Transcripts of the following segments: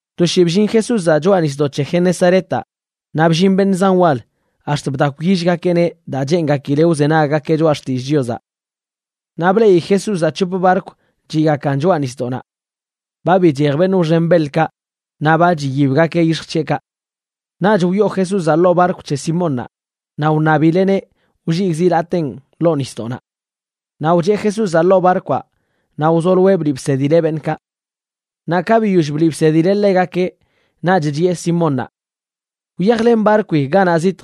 To shii bllin Jesúzaꞌ choꞌa nisdoꞌ c̱he Genesaretaꞌ naꞌ bllin beṉꞌ zan wal ax̱t bdakwyillgakeꞌneꞌ, daa cheengakileꞌ wzenaggakeꞌ choꞌa xtillꞌ Chiozaꞌ. Naꞌ bleꞌi Jesúzaꞌ c̱hop barkw chiꞌgakan choꞌa nisdoꞌnaꞌ. Ba bichej beṉꞌ wxen beḻkaꞌ naꞌ ba chiyibgakeꞌ yix̱j c̱heꞌkaꞌ. Naꞌch wyoo Jesúzaꞌ ḻoo barkw c̱he Simónnaꞌ, naꞌ wṉabileꞌneꞌ wlligꞌ zilateen ḻoo nisdoꞌnaꞌ. Naꞌ wcheꞌ Jesúzaꞌ ḻoo barkwaꞌ naꞌ wzoloeꞌ bliꞌ bsedileꞌ beṉꞌkaꞌ. Naꞌ ka biyoll bliꞌ bsedileꞌ ḻegakeꞌ, naꞌch chiꞌe Simónnaꞌ: ―Wyajlen barkwi ganaꞌ zitj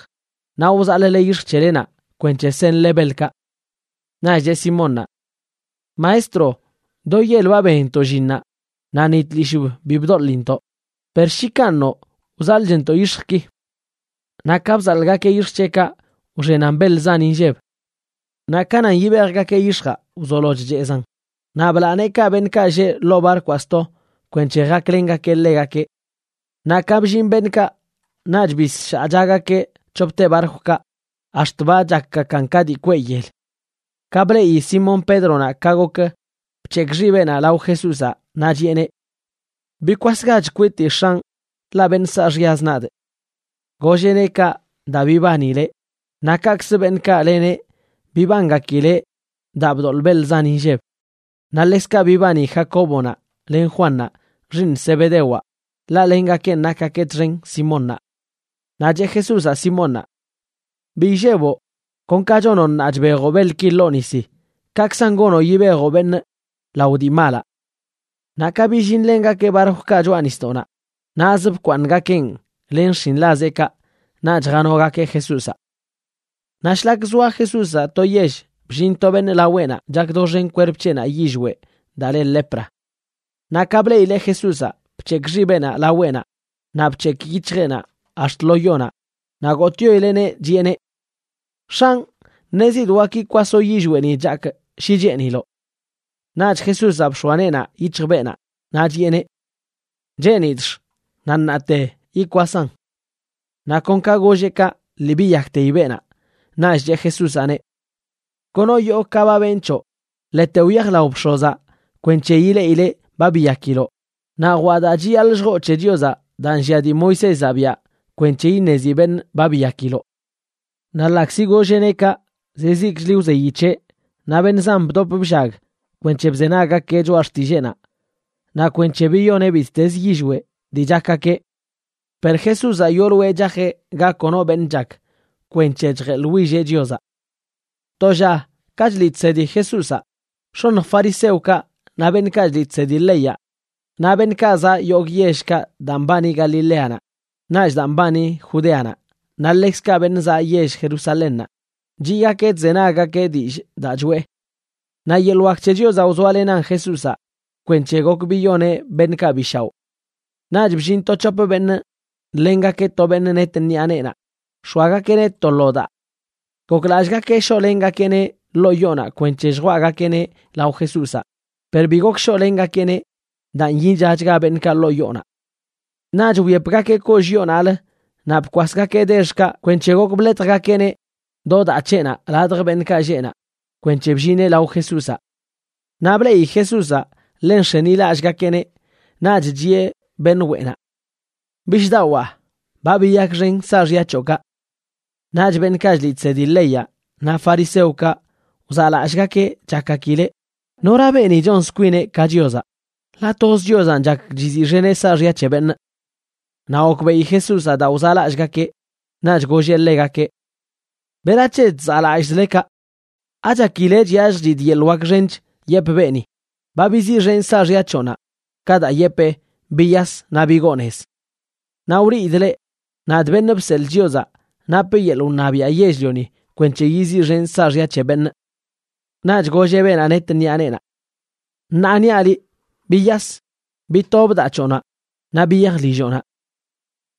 naꞌ wzaḻꞌle yix̱j c̱helenaꞌ kwenc̱he senle beḻkaꞌ. Naꞌch cheꞌ Simónnaꞌ: ―Maestro, do yel ba benntoꞌ llinnaꞌ naꞌ ni tlishꞌb bi bdoḻintoꞌ, per shi kanꞌ noꞌ, wzaḻꞌchntoꞌ yix̱jki. Naꞌ ka bzaḻꞌgakeꞌ yix̱j c̱heꞌkaꞌ, wxenan beḻ zan inlleb. Naꞌ ka nan yibejgakeꞌ yix̱jaꞌ wzolo chchezaꞌn. Naꞌ blaa neekaꞌ beṉꞌkaꞌ lleꞌ ḻoo barkwaꞌ sto kwenc̱he jaklengakeꞌ ḻegakeꞌ. Naꞌ ka bllin beṉꞌkaꞌ, naꞌch bisshaꞌchagakeꞌ c̱hopte barkwkaꞌ ax̱t ba chakgakan ka dii kweꞌ yel. Ka bleꞌi Simón Pédronaꞌ ka gok, bc̱hekꞌ xibeꞌnaꞌ lao Jesúzaꞌ naꞌ chiꞌeneꞌ: ―Bikwasgach kwitii X̱anꞌ, ḻaꞌ beṉꞌ saaxyaz nadꞌ. Golleꞌneꞌ kaꞌ daa bibanileꞌ, naꞌ kaꞌkzə beṉꞌkaꞌ leneꞌ bibangakileꞌ daa bdoḻꞌ beḻ zan inlleb. Naꞌ ḻekzkaꞌ bibani Jacóbonaꞌ len Juannaꞌ xiiṉ Zebedewaꞌ, ḻaꞌ lengakenꞌ nakgakeꞌ txen Simónnaꞌ. Naꞌ cheꞌ Jesúzaꞌ Simónnaꞌ: ―Bi illeboꞌ. Kon ka chonoꞌ ṉaa chbejoꞌ beḻki ḻoo nisi, kaꞌkzan gonoꞌ yibejoꞌ beṉꞌ lao dii malaꞌ. Naꞌ ka billinlengakeꞌ barkwkaꞌ choꞌa nisdoꞌnaꞌ, naꞌzə bkwaaṉgakeꞌn len xshinḻazeꞌkaꞌ naꞌch janogakeꞌ Jesúzaꞌ. Naꞌ shlak zoa Jesúzaꞌ to yell, bllin to beṉꞌ laweꞌnaꞌ chak doxen kwerp c̱heꞌnaꞌ yillweꞌ daa le lepra. Naꞌ ka bleꞌileꞌ Jesúzaꞌ, bc̱hekꞌ xibeꞌnaꞌ laweꞌnaꞌ naꞌ bc̱hekꞌ yic̱hjeꞌnaꞌ ax̱t lo yonaꞌ naꞌ gotꞌyoileꞌneꞌ, chiꞌeneꞌ: ―X̱anꞌ, ṉezidꞌ wak yikwasoꞌ yillweꞌni chakꞌ shi cheeniloꞌ. Naꞌch Jesúzaꞌ bx̱oa neenaꞌ yic̱hj beenaꞌ, naꞌ chiꞌeneꞌ: ―Cheenidꞌx. Naꞌ ṉaate yikwasaꞌn. Naꞌ kon ka golleꞌ kaꞌ lii biyakteyi beenaꞌ. Naꞌch cheꞌ Jesúzaꞌneꞌ: ―Kono yoo ka ba benꞌ c̱hoꞌ. Ḻete wyaj lao bx̱ozaꞌ kwenc̱he ileꞌileꞌ ba biyakiloꞌ, naꞌ jwaꞌ daa chiyaḻꞌ lljoo c̱he Chiozaꞌ daa nllia dii Moisézaꞌ biaꞌ kwenc̱he iṉezi beṉꞌ ba biyakiloꞌ. Naꞌ ḻaꞌkzi golleꞌneꞌ kaꞌ, zizikchli wzeyi c̱heꞌ, naꞌ beṉꞌ zan bdop bllaggakeꞌ kwenc̱he bzenaggakeꞌ choꞌa xtilleenaꞌ naꞌ kwenc̱he biyoneꞌ bittezə yillweꞌ dii chakgakeꞌ. Per Jesúzaꞌ yooloeꞌ chajeꞌ ga kono beṉꞌ chak kwenc̱he chjeḻwilleꞌ Chiozaꞌ. To lla ka chliꞌ chsedi Jesúzaꞌ, x̱oṉj fariseokaꞌ naꞌ beṉꞌkaꞌ chliꞌ chsedi leyaꞌ, naꞌ beṉꞌkaꞌ zaꞌ yogꞌ yellkaꞌ daa mbani Galileanaꞌ naꞌch daa mbani Judeanaꞌ naꞌ ḻekzkaꞌ beṉꞌ zaꞌ yell Jerusalénnaꞌ, chiꞌgakeꞌ chzenaggakeꞌ dillꞌ daa choꞌe. Naꞌ yeḻꞌ wak c̱he Chiozaꞌ wzoalenan Jesúzaꞌ kwenc̱he gok biyoneꞌ beṉꞌkaꞌ bi shaoꞌ. Naꞌch bllin to c̱hop beṉꞌ nḻengakeꞌ to beṉꞌ net ṉiꞌa neenaꞌ nx̱oagakeꞌneꞌ to lo daa. Goklallꞌgakeꞌ shoꞌlengakeꞌneꞌ ḻoo yoonaꞌ kwenc̱he lljwaꞌgakeꞌneꞌ lao Jesúzaꞌ, per bi gok shoꞌlengakeꞌneꞌ daa nyichachga beṉꞌkaꞌ ḻoo yoonaꞌ. Naꞌch wyepgakeꞌ kollꞌ yoonaꞌlə naꞌ bkwasgakeꞌ dexkaꞌ kwenc̱he gok bḻetjgakeꞌneꞌ do daa c̱heꞌnaꞌ ladj beṉꞌkaꞌ lleꞌ naꞌ kwenc̱he bllineꞌ lao Jesúzaꞌ. Naꞌ bleꞌi Jesúzaꞌ ḻe nx̱enilallꞌgakeꞌneꞌ, naꞌch chiꞌe beṉꞌ weꞌnaꞌ: ―Bishꞌdawaa, ba biyakxen saaxya c̱hoꞌkaꞌ. Naꞌch beṉꞌkaꞌ chliꞌ chsedi leyaꞌ naꞌ fariseokaꞌ wzaꞌlallꞌgakeꞌ, chakgakileꞌ: “¿Nora beeni chonz kwineꞌ ka Chiozaꞌ? ¡Ḻaꞌ toz Chiozanꞌ chak chiziꞌxeneꞌ saaxya c̱he beṉꞌ!” Naꞌ gokbeꞌi Jesúzaꞌ daa wzaꞌlallꞌgakeꞌ, naꞌch golleꞌ ḻegakeꞌ: ―¿Berac̱he chzaꞌlallꞌzle kaꞌ? ¿Achakile chyalljchidꞌ yeḻꞌ wak xench yepꞌ beeni: “Ba biziꞌxenꞌ saaxya c̱hoꞌnaꞌ”, ka daa yepee: “Biyas naꞌ bigoo nez”? Naꞌ wliidꞌ leꞌ, nadꞌ, Beṉꞌ Bseḻꞌ Chiozaꞌ, napꞌ yeḻꞌ wṉabiaꞌ yell-lioni kwenc̱he yiziꞌxenꞌ saaxya c̱he beṉꞌ. Naꞌch golleꞌ beenaꞌ net ṉiꞌa neenaꞌ: ―Ṉaa niaꞌ liꞌ, biyas, bitob daa c̱hoꞌnaꞌ naꞌ biyaj lilloꞌnaꞌ.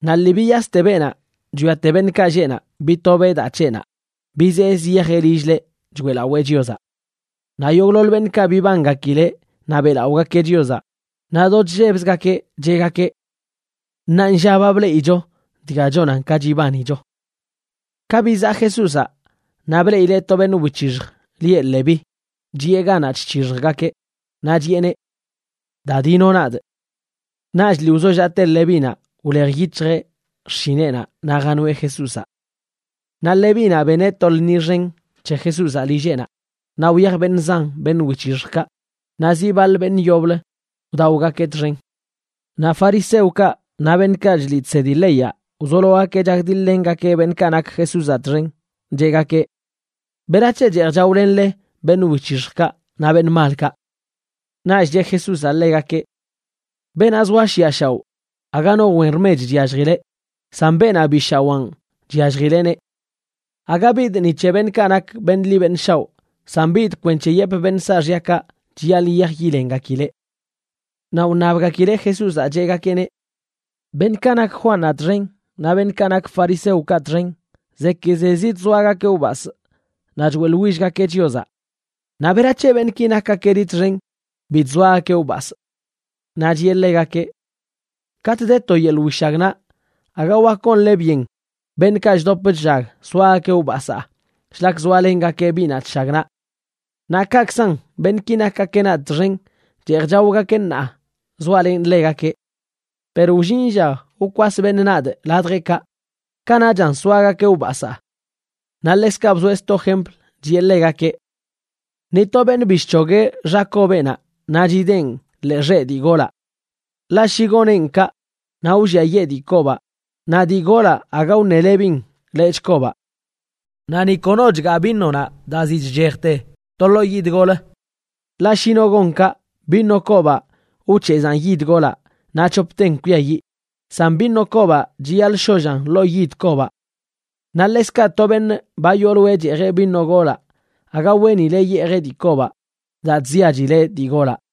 Naꞌ lii biyaste beenaꞌ chwiate beṉꞌkaꞌ lleꞌ naꞌ, bitobeꞌ daa c̱heꞌnaꞌ bizee ziyajeꞌ lill-leꞌ choeꞌlawee Chiozaꞌ. Naꞌ yogꞌḻoḻ beṉꞌkaꞌ bibangakileꞌ naꞌ beꞌlaꞌogakeꞌ Chiozaꞌ, naꞌ do chllebzgakeꞌ cheꞌgakeꞌ: ―Ṉaanlla ba bleꞌicho dga chonan ka chibanicho. Ka bizaꞌ Jesúzaꞌ, naꞌ bleꞌileꞌ to beṉꞌ wic̱hixj lieꞌ Leví, chiꞌe ganaꞌ chc̱hixjgakeꞌ. Naꞌ chiꞌeneꞌ: ―Da, dino nadꞌ. Naꞌch lii wzollaꞌte Levínaꞌ, wlej yic̱hjeꞌ xshineꞌnaꞌ naꞌ janoeꞌ Jesúzaꞌ. Naꞌ Levínaꞌ beneꞌ to lṉi xen c̱he Jesúzaꞌ lilleꞌnaꞌ. Naꞌ wyaj beṉꞌ zan beṉꞌ wic̱hixjkaꞌ naꞌ zi baḻ beṉꞌ yoblə wdaogakeꞌ txen. Naꞌ fariseokaꞌ naꞌ beṉꞌkaꞌ chliꞌ chsedi leyaꞌ wzologakeꞌ chakdiḻ-lengakeꞌ beṉꞌkaꞌ nak Jesúzaꞌ txen, cheꞌgakeꞌ: ―¿Berac̱he cheej chaolenle beṉꞌ wic̱hixjkaꞌ naꞌ beṉꞌ malkaꞌ? Naꞌch cheꞌ Jesúzaꞌ ḻegakeꞌ: ―Beenaꞌ zoa shiꞌa shaoꞌ aga no wen rmech chyalljileꞌ, san beenaꞌ bi shawaan chyalljileꞌneꞌ. Aga bidꞌ ni c̱he beṉꞌkaꞌ nak beṉꞌ ḻi beṉꞌ shaoꞌ, san bidꞌ kwenc̱he yepꞌ beṉꞌ saaxyakaꞌ chiyaḻꞌ yiyaj yilengakileꞌ. Naꞌ wṉabgakileꞌ Jesúzaꞌ, cheꞌgakeꞌneꞌ: ―Beṉꞌkaꞌ nak Juannaꞌ txen naꞌ beṉꞌkaꞌ nak fariseokaꞌ txen zekizezi chzoagakeꞌ wbasꞌ naꞌ choeꞌḻwillgakeꞌ Chiozaꞌ. Naꞌ ¿berac̱he beṉꞌki nakgakeꞌ liꞌ txen bi chzoagakeꞌ wbasꞌ? Naꞌ chiꞌe ḻegakeꞌ: ―Katꞌ de to yeḻꞌ wishagnaꞌ, aga wak gonle byen beṉꞌkaꞌ chdop chllag soagakeꞌ wbasaa shlak zoalengakeꞌ biꞌnaꞌ chshagnaꞌ. Naꞌ kaꞌkzan beṉꞌki nakgakeꞌ nadꞌ txen, cheej chaogakeꞌ ṉaa zoalenꞌ ḻegakeꞌ. Per wllin lla wkwas beṉꞌ nadꞌ ladjeꞌkaꞌ, kanaꞌchan soagakeꞌ wbasaa. Naꞌ ḻekzkaꞌ bzoeꞌ sto jempl, chiꞌe ḻegakeꞌ: ―Ni to beṉꞌ bi chc̱hogueꞌ xa kobeꞌnaꞌ naꞌ chideen ḻee xeꞌ dii golaꞌ. Ḻaꞌ shi goneꞌn kaꞌ, naꞌ wlliayee dii kobaꞌ, naꞌ dii golaꞌ aga wṉelebin lechꞌ kobaꞌ. Naꞌ ni kono chgaa vinonaꞌ daa ziꞌ chchejte to ḻoo yid golə. Ḻaꞌ shi no gon kaꞌ, vino kobaꞌ wc̱hezaan yid golaꞌ naꞌ c̱hopten kwiayiꞌ. San vino kobaꞌ chiyaḻꞌ shollan ḻoo yid kobaꞌ. Naꞌ ḻekzkaꞌ to beṉꞌ ba yooloeꞌ cheejeꞌ vino golaꞌ aga weenileꞌ yeejeꞌ dii kobaꞌ, daa chziachileꞌ dii golaꞌ.